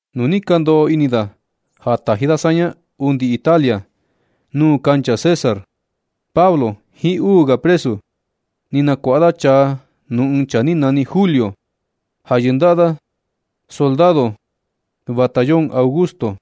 Nu ni ka ndoꞌo ini da ja taji da saña undi Italia, nuu kancha César, Pablo jiin uu ga presu, ni nakuaꞌa da chaa nuu ɨɨn chaa ni nani Julio, ja yɨndaꞌa da soldado batallón Augusto.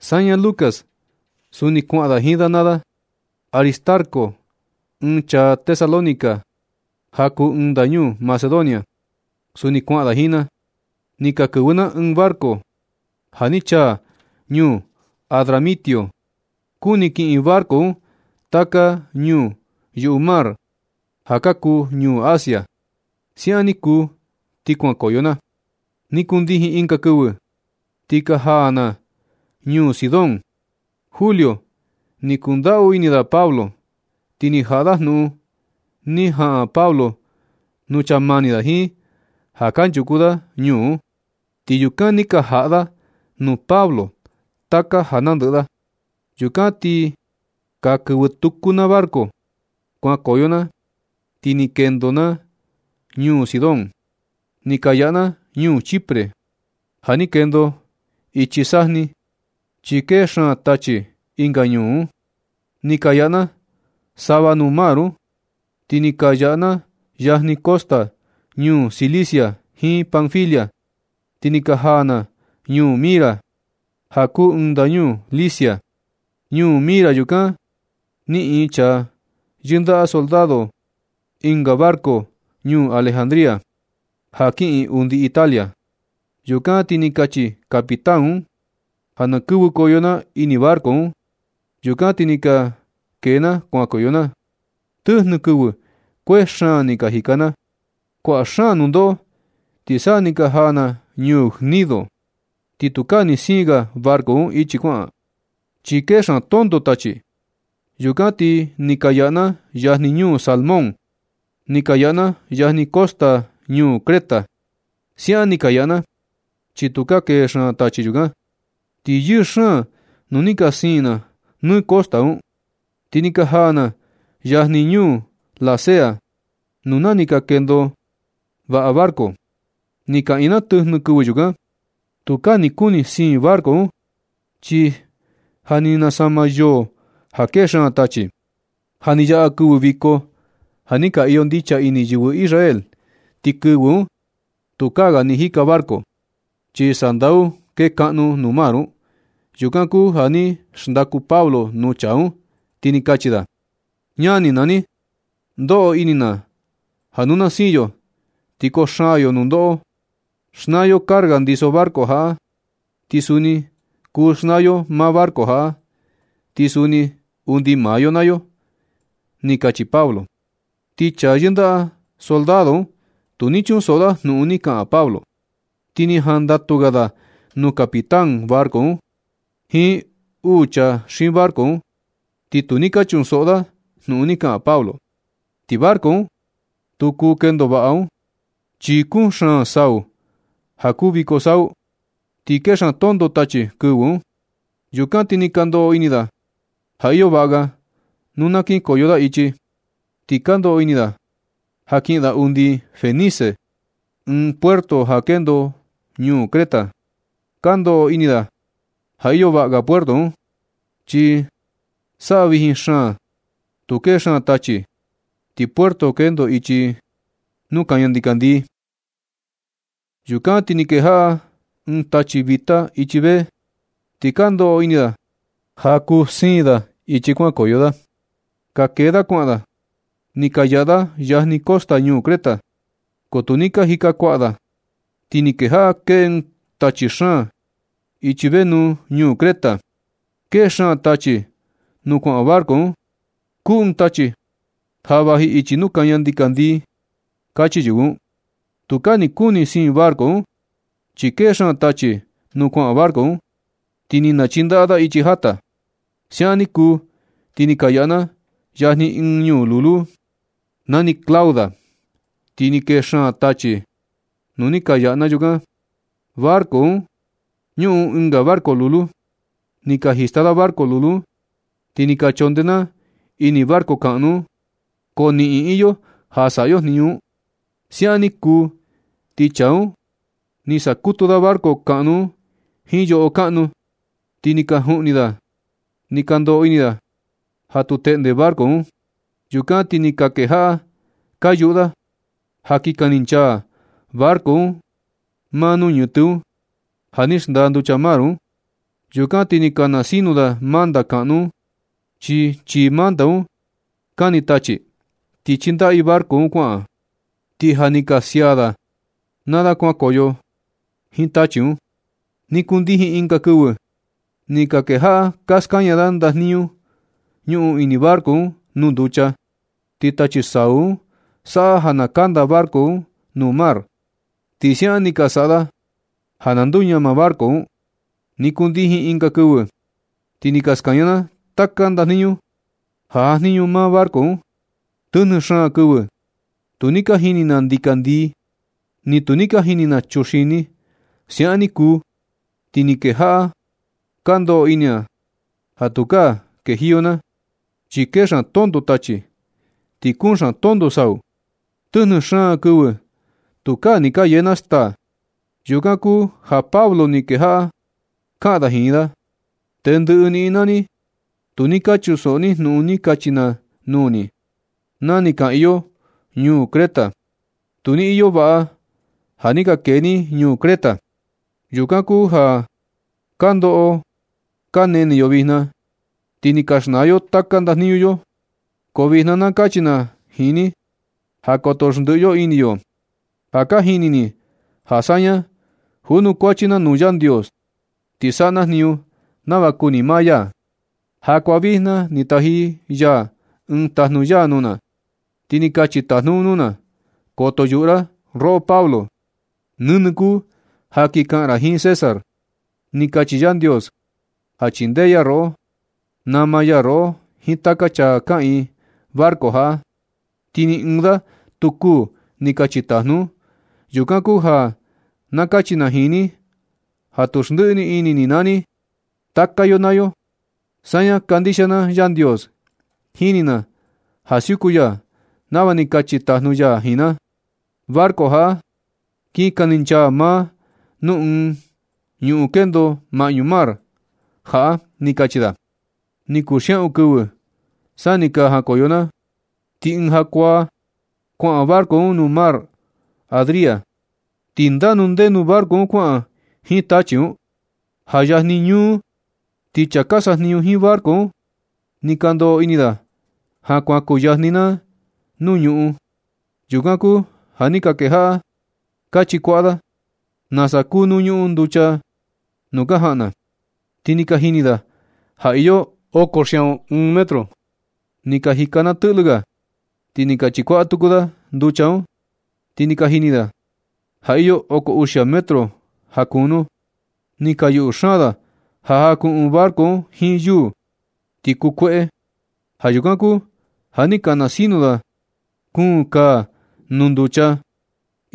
Saña Lucas, suni kuaꞌan na jiin da naa da. Aristarco, ɨɨn chaa Tesalónica ja kuu ɨɨn ndañuu Macedonia, suni kuaꞌan da jiin na. Ni ka kɨvɨ na ɨɨn barco ja ni chaa ñuu Adramitio. Kuni kiꞌin barco un taka ñuu yuꞌu mar ja ka kuu ñuu Asia. Siaꞌan ni kuu, ti kuankoyo na. Ni kundijin ɨnga kɨvɨ, ti ka jaa na ñuu Sidón. Julio ni kundaꞌu ini da Pablo, ti ni jaꞌa da jnuꞌun ni jaꞌan Pablo nuu chaa mani da jiin ja kanchuku da ñuu un, ti yukan ni ka jaꞌa da nuu Pablo taka ja nandɨꞌɨ da. Yukan ti ka kɨvɨ tuku na barco. Kuankoyo na ti ni kendo na ñuu Sidón. Ni ka yaꞌa na ñuu Chipre, ja ni kendo ichi sajni, chi kee xaan tachi ɨnga ñuu un. Ni ka yaꞌa na sava nuu mar un, ti ni ka yaꞌa na yajni costa ñuu Cilicia jiin Panfilia, ti ni ka jaa na ñuu Mira, ja kuu ɨɨn ndañuu Licia. Ñuu Mira yukan ni niꞌin chaa yɨndaꞌa soldado un ɨnga barco ñuu Alejandría, ja kiꞌin undi Italia. Yukan ti ni kachi capitán un ja na kɨvɨkoyo na ini barco un. Yukan ti ni ka kee na kuankoyo na. Tɨjnɨ kɨvɨ kuee xaan ni ka jika na. Kuaꞌa xaan nundoꞌo, ti sa ni ka jaa na ñuu Gnido. Ti tukaa ni siin ga barco un ichi kuaꞌan, chi kee xaan tonto tachi. Yukan ti ni ka yaꞌa na yajni ñuu Salmón, ni ka yaꞌa na yajni costa ñuu Creta. Siaꞌan ni ka yaꞌa na, chi tukaa kee xaan tachi yukan. Ti yɨɨ xaan nu ni ka siin na nɨ kani costa un, ti ni ka jaa na yajni ñuu Lasea nuu nani “Ka kendo vaꞌa barco.” Ni kaꞌiin na tɨjnɨ kɨvɨ yukan. Tukaa ni kuni siin barco un, chi ja ni nasama yoo ja kee xaan tachi. Ja ni yaꞌa kɨvɨ viko ja ni ka iyo ndicha ini yɨvɨ Israel, ti kɨvɨ un tukaa ga ni jika barco, chi sandau kekaꞌnu nuu mar un. Yukan kuu ja ni xndaku Pablo nuu chaa un, ti ni kachi da: ―Ñani naa ni, ndoꞌo ini na ja nu na siin yo, ti koo xaan yo nundoꞌo. Xnaa yo carga ndiso barco jaꞌa, ti suni kuu xnaa yo maa barco jaꞌa, ti suni undi maa yo naa yo ―ni kachi Pablo. Ti chaa yɨndaꞌa soldado un tu ni chunsoꞌo da jnuꞌun ni kaꞌan Pablo, ti ni jandatu ga da nuu capitán barco un jiin nuu chaa xiin barco un, ti tu ni ka chunsoꞌo da jnuꞌun ni kaꞌan Pablo. Ti barco un, tu kuu kendo vaꞌa un, chi kuun xaan sau ja kuu viko sau, ti kee xaan tonto tachi kɨvɨ un. Yukan ti ni ka ndoꞌo ini da ja iyo vaꞌa ga nu na kinkoyo da ichi, ti ka ndoꞌo ini da ja kiꞌin da undi Fenice, ɨɨn puerto ja kendo ñuu Creta. Ka ndoꞌo ini da ja iyo vaꞌa ga puerto un, chi saꞌa vijin xaan, tu kee xaan tachi, ti puerto kendo ichi nuu kaña ndikandii. Yukan ti ni kejaꞌa kee ɨɨn tachi vita ichi vee. Ti ka ndoꞌo ini da ja kuu siin da ichi kuankoyo da. Ka kee da kuaꞌan da. Ni ka yaꞌa da yajni costa ñuu Creta. Ko tu ni ka jika kuaꞌa da, ti ni kejaꞌa kee ɨɨn tachi xaan ichi nenu ñuu Creta. Kee xaan tachi nuu kuaꞌan barco un. Kuu ɨɨn tachi ja vaji ichi nuu kaña ndikandii, kachi yɨvɨ un. Tukaa ni kuni siin barco un, chi kee xaan tachi nuu kuaꞌan barco un, ti ni nachindaꞌa ichi jata. Siaꞌan ni kuu, ti ni ka yaꞌa na yajni ɨɨn ñuu lulu nani Clauda. Tu ni kee xaan tachi nu ni ka yaꞌa na yukan. Barco un ñuꞌun ɨnga barco lulu. Ni ka jista da barco lulu un, ti ni ka na chondee na ini barco kaꞌnu un, ko niꞌin iyo ja saꞌa yo jniñu un. Siaꞌan ni kuu, ti chaa un ni sakutu da barco kaꞌnu un jiin yoꞌo kaꞌnu, ti ni ka juꞌni da. Ni ka ndoꞌo ini da ja tu teꞌnde barco un. Yukan ti ni ka kejaꞌa ka yuꞌu da ja kin kaninchaa barco un maa nuu ñɨtɨ un ja ni xndaa nducha mar un. Yukan ti ni ka nasinu da manta kaꞌnu un, chi chii manta un kani tachi, ti chindaꞌa i barco un kuaꞌan. Ti ni ka sia da maa da kuankoyo da jiin tachi un. Ni kundijin ɨnga kɨvɨ, ni ka kejaꞌa ka skaña da ndajniñu ñuꞌun ini barco un nuu nducha, chi tachi sau un saꞌa ja kanda barco un nuu mar. Ti siaꞌan ni ka saꞌa da ja na nduñama barco un. Ni kundijin ɨnga kɨvɨ, ti ni ka skaña na taka ndajniñu ja jajniñu maa barco un. Tɨjnɨ xaan kɨvɨ tu ni ka jini na ndikandii, ni tu ni ka jini na chuxini. Siaꞌan ni kuu, ti ni ka kejaꞌa ka ndoꞌo ini na ja tukaa kendajiyo na, chi kee xaan tonto tachi, ti kuun xaan tonto sau. Tɨjnɨ xaan kɨvɨ tukaa ni ka yee na staa. Yukan kuu ja Pablo ni kejaꞌa kaꞌan da jiin da: ―Tendɨꞌɨ niꞌin naa ni, tu ni ka chunsoꞌo ni jnuꞌun ni kachi na nuu ni, na ni kaꞌiin yo ñuu Creta. Tu ni iyo vaꞌa ja ni ka kee ni ñuu Creta. Yukan kuu ja kandoꞌo kanene yo vijna, ti ni ka xnaa yo taka ndajniñu yo. Ko vijna na kachi na jiin ni ja koto xndiꞌi yo ini yo. Ja ka jini ni ja saña junukuachi na nuu Yandios, ti saꞌa na jniñu nava kuni maa ya. Jakuaa vijna ni taji ya ɨɨn tajnu ya nuu na, ti ni kachi tajnu un nuu na: “Koto yuꞌu ra, roꞌo Pablo. Nɨnɨ kuu ja kin kaꞌan ra jiin César. Ni kachi Yandios ja chindee ya roꞌo. Nama ya roꞌo jiin taka chaa kaꞌiin barco jaꞌa, ti ni ɨɨn da tu kuū”, ni kachi tajnu un. Yukan kuu ja na kachi na jiin ni ja tu xndiꞌi ni ini ni naa ni, taka yo naa yo. Saña kandixia na Yandios. Jini na ja siuku ya nava ni kachi tajnu ya jiin na. Barco jaꞌa kin kaninchaa maa nuu ɨɨn ñuꞌun kendo maꞌñu mar jaꞌa ―ni kachi da. Ni kuu xiaꞌun kɨvɨ sa ni ka jankoyo na. Ti ɨɨn jakuaa kuaꞌan barco un nuu mar Adria, ti ndanu ndenu barco un kuaꞌan jiin tachi un. Ja yajni ñúú, ti chaa ka sajniñu jiin barco un, ni ka ndoꞌo ini da ja kuan kuyajni na nuu ñuꞌun. Yukan kuu ja ni ka kejaꞌa da ka chikuaꞌa da nasa kunu ñuꞌun nducha nuu ka jaꞌan na, ti ni ka jini da ja iyo oko xiaꞌun ɨɨn metro. Ni ka jika na tɨꞌlɨ ga, ti ni ka chikuaꞌa tuku da nducha un, ti ni ka jini da ja iyo oko uxia metro ja kunu. Ni ka yuꞌu xaan da ja jakuꞌun barco un jiin yuu, ti kuu kueꞌe. Ja yukan kuu ja ni ka nasinu da kuun kaa nuu nducha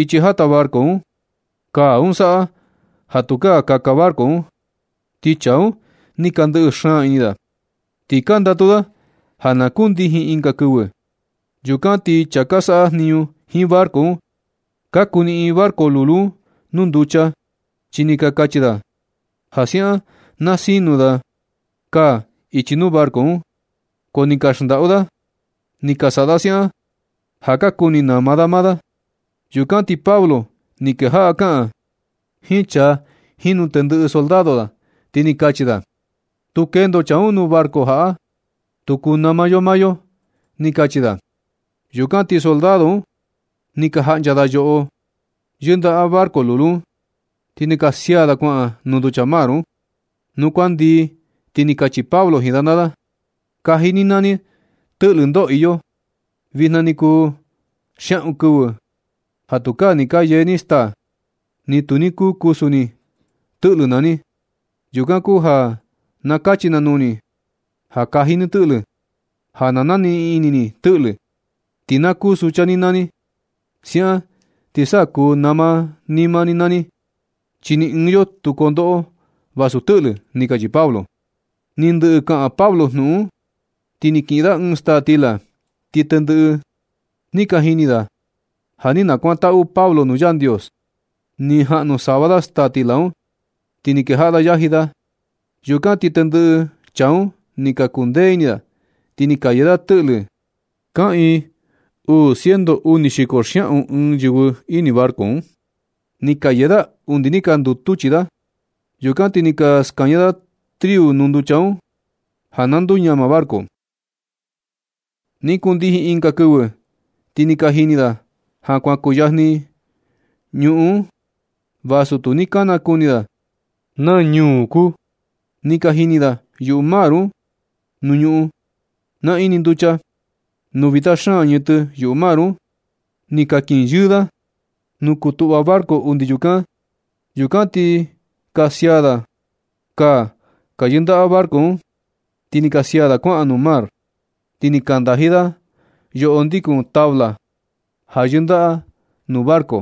ichi jata barco un. Kaa un saꞌa ja tukaa kaka barco un. Ti chaa un ni ka ndɨꞌɨ xaan ini da, ti ka ndatu da ja na kundijin ɨnga kɨvɨ. Yukan ti chaa ka saꞌa jniñu jiin barco un, ka kuniꞌin barco lulu un nuu nducha, chi ni ka kachi da ja siaꞌan na sinu da kaa ichi nuu barco un, ko ni ka xndaꞌu da. Ni ka saꞌa da siaꞌan ja ka kuni nama da maa da. Yukan ti Pablo ni kejaꞌa kaꞌan da jiin chaa jiin nuu tendɨꞌɨ soldado da, ti ni kachi da: ―Nu tu kendo chaa un nuu barco jaꞌa, tu kuu nama yo maa yo ―ni kachi da. Yukan na ti soldado un ni ka jaꞌncha da yoꞌo yɨndaꞌa barco lulu un, ti ni ka sia da kuaꞌan nuu nducha un. Nu kuan ndii, ti ni kachi Pablo jiin da naa da: ―Kaji ni naa ni tɨꞌlɨ ndoo iyo. Vijna ni kuu xiaꞌun kɨvɨ ja tukaa ni ka yee ni staa, ni tu ni kuu kusu ni tɨꞌlɨ naa ni. Yukan kuu ja na kachi na nuu ni ja kaji ni tɨꞌlɨ ja na ja naniꞌin ini ni tɨꞌlɨ, ti na kuu sucha ni naa ni. Siaꞌan ti sa kuu nama ni maa ni naa ni, chi ni ɨɨn yo tu kondoꞌo vasu tɨꞌlɨ ―ni kachi Pablo. Ni ndɨꞌɨ kaꞌan Pablo jnuꞌun un, ni kiꞌin da ɨɨn staa stila, ti tendɨꞌɨ da ni ka jini ja ni nakuantaꞌu Pablo nuu Yandios. Ni jaꞌnu sava da staa stila un, ti ni kejaꞌa da yaji da. Yukan ti tendɨꞌɨ chaa un ni ka kundee ini da, ti ni ka yee da tɨꞌlɨ. Kaꞌiin uu ciento uni xiko xiaꞌun ɨɨn yɨvɨ ini barco un. Ni ka yee da undi ni ka ndutu chii da. Yukan ti ni ka skaña da triu nuu nducha un ja na nduñama barco. Ni kundijin ɨnga kɨvɨ, ti ni ka jini da ja kuan kuyajni ñuꞌun un, vasu tu ni ka nakuni da naa ñuu kuu. Ni ka jini da yuꞌu mar un nuu ñuꞌun naꞌin nducha, nuu vita xaan ñɨtɨ yuꞌu mar un. Ni ka kinyɨɨ da nu kuu tuꞌva barco undi yukan. Yukan ti ni ka sia da kaa ka yɨndaka barco un, ti ni ka sia da kuaꞌan nuu mar. Ti ni ka ndaji da yoꞌo ndikun tabla ja yɨndaꞌa nuu barco.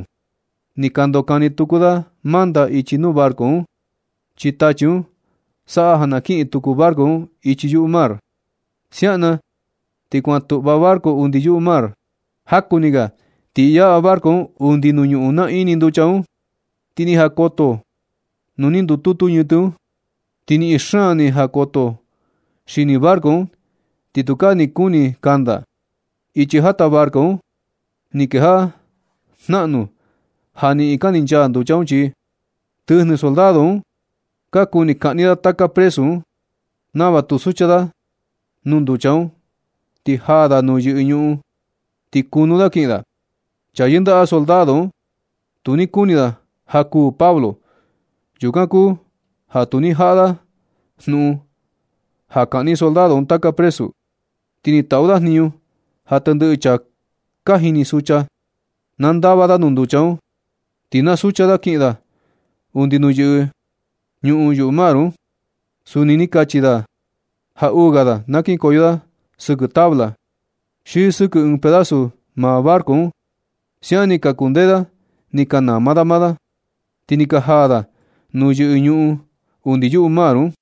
Ni ka ndokani tuku da manta ichi nuu barco un, chi tachi un saꞌa ja na kiꞌin tuku barco un ichi yuꞌu mar. Siaꞌan na ti kuantuꞌva barco undi yuꞌu mar. Jaku ni ga ti yaꞌa barco un undi nuu ñuꞌun naꞌin nducha un, ti ni jakoto nuu ni ndututu ñɨtɨ un, ti niꞌin xaan ni jakoto xini barco un, ti tukaa ni kuni kanda. Ichi jata barco un ni kejaꞌa jnaꞌnu ja niꞌin kaninchaa nducha un chii. Tɨjnɨ soldado un ka kuni kaꞌni da taka presu un, nava tu sucha da nuu nducha un, ti jaa da nuu yɨꞌɨ ñuꞌun, ti kunu da kiꞌin da. Chaa yindaꞌa soldado un tu ni kuni da ja kuū Pablo. Yukan kuu ja tu ni jaꞌa da jnuꞌun ja kaꞌni soldado un taka presu un. Ti ni taꞌu da jniñu ja tendɨꞌɨ chaa ka jini sucha, na ndava da nuu nducha un, ti na sucha da kiꞌin da undi nuu yɨꞌɨ ñuꞌun yuꞌu mar un. Suni ni kachi da ja uu ga da na kinkoyo da sɨkɨ tabla, xi sɨkɨ ɨɨn pedazo maa barco un. Siaꞌan ni ka kundee da ni ka nama da maa da, ti ni ka jaa da nuu yɨꞌɨ ñuꞌun undi yuꞌu mar un.